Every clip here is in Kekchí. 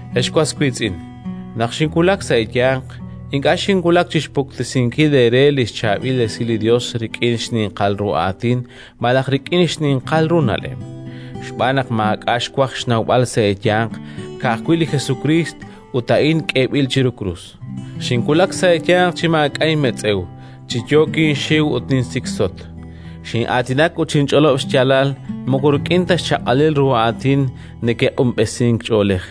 Ex was wiitz'in, naq xinwulak sa' eeyanq, ink'a' xinwulak chi xpuktesinkil eere li xChaab'il Esil li Yos rik'in xninqal ru aatin malaj rik'in xninqal ru na'leb', xb'aan naq maak'a' xwaj xnawb'al sa' eeyanq, ka'ajwi' li Jesukriist, ut a'in k'eeb'il chiru krus. Xinwulak sa' eeyanq chi maak'a' inmetz'ew, chi yook inxiw ut ninsiksotk. Xin'aatinak ut xinch'olob' xyaalal moko rik'in ta xchaq'alil ru aatin neke'q'unb'esink ch'oolej,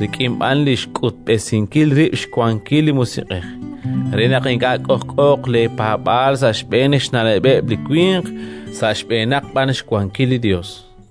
rik'in b'an li xk'utb'esinkil rib' xwankil li Musiq'ej, re naq ink'a' k'ojk'ooq leepaab'aal sa' xb'een xna'leb'eb' li winq, sa' xb'eenaq b'an xwankil li Yos.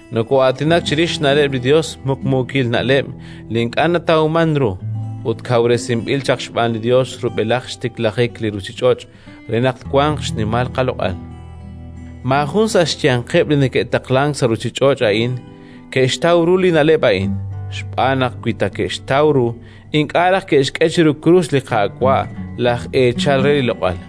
Nokoo'aatinak chirix xna'leb' li Yos, muqmuukil na'leb' li ink'a' natawmank ru ut kawresinb'il chaq xb'aan li Yos rub'elaj xtiklajik li ruuchich'och' re naq twanq xnimal qaloq'al. Maajun sa' xyanqeb' li neke'taqlank sa' li ruuchich'och' a'in ke'xtaw ru li na'leb' a'in, xb'aan naq wi ta ke'xtaw ru, ink'a' raj ke'xk'e chiru krus li Qaawa', laj Eechal re li loq'al.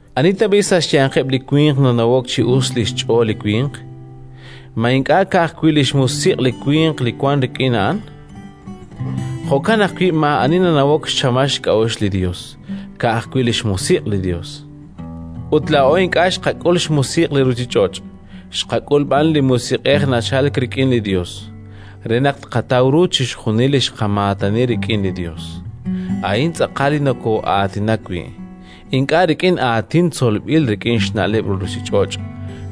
Ani tab'i' sa' xyanqeb' li winq nanawok chi us li xch'ool li winq? Ma ink'a' ka'ajwi' li xmusiq' li winq li wank rik'in a'an? Jo'kan ajwi' maa'ani nanawok xchamal xk'a'uxl li Yos, ka'ajwi' li xMusiq' li Yos. Ut laa'o ink'a' xqak'ul xmusiq' li ruuchich'och', xqak'ul b'an li Musiq'ej li nachalk rik'in li Yos, re naq tqataw ru chixjunil li xqamaatani rik'in li Yos. A'in tz'aqal li nokoo'aatinak wi', ink'a' rik'in aatin tzolb'il rik'in xna'leb' li ruuchich'och',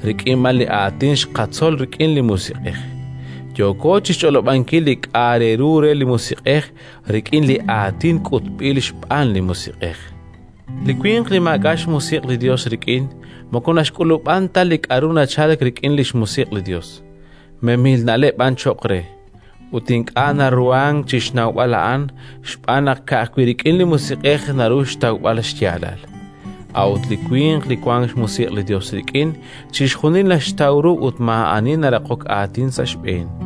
rik'in b'an li aatin xqatzol rik'in li Musiq'ej: yooko chi xch'olob'ankil li k'a' re ru re li Musiq'ej, rik'in li aatin k'utb'il xb'aan li Musiq'ej. Li winq li maak'a' xMusiq' li Yos rik'in moko naxk'ulub'an ta li k'aru nachalk rik'in xMusiq' li Yos; memil na'leb' b'an cho'q re. Ut ink'a' naruhank chi xnawb'al a'an, xb'aan naq ka'ajwi' rik'in li Musiq'ej naru xtawb'al xyaalal. A'ut li winq li wank xMusiq' li Yos rik'in, chixjunil naxtaw ru ut maa'ani naraqok aatin sa' xb'een.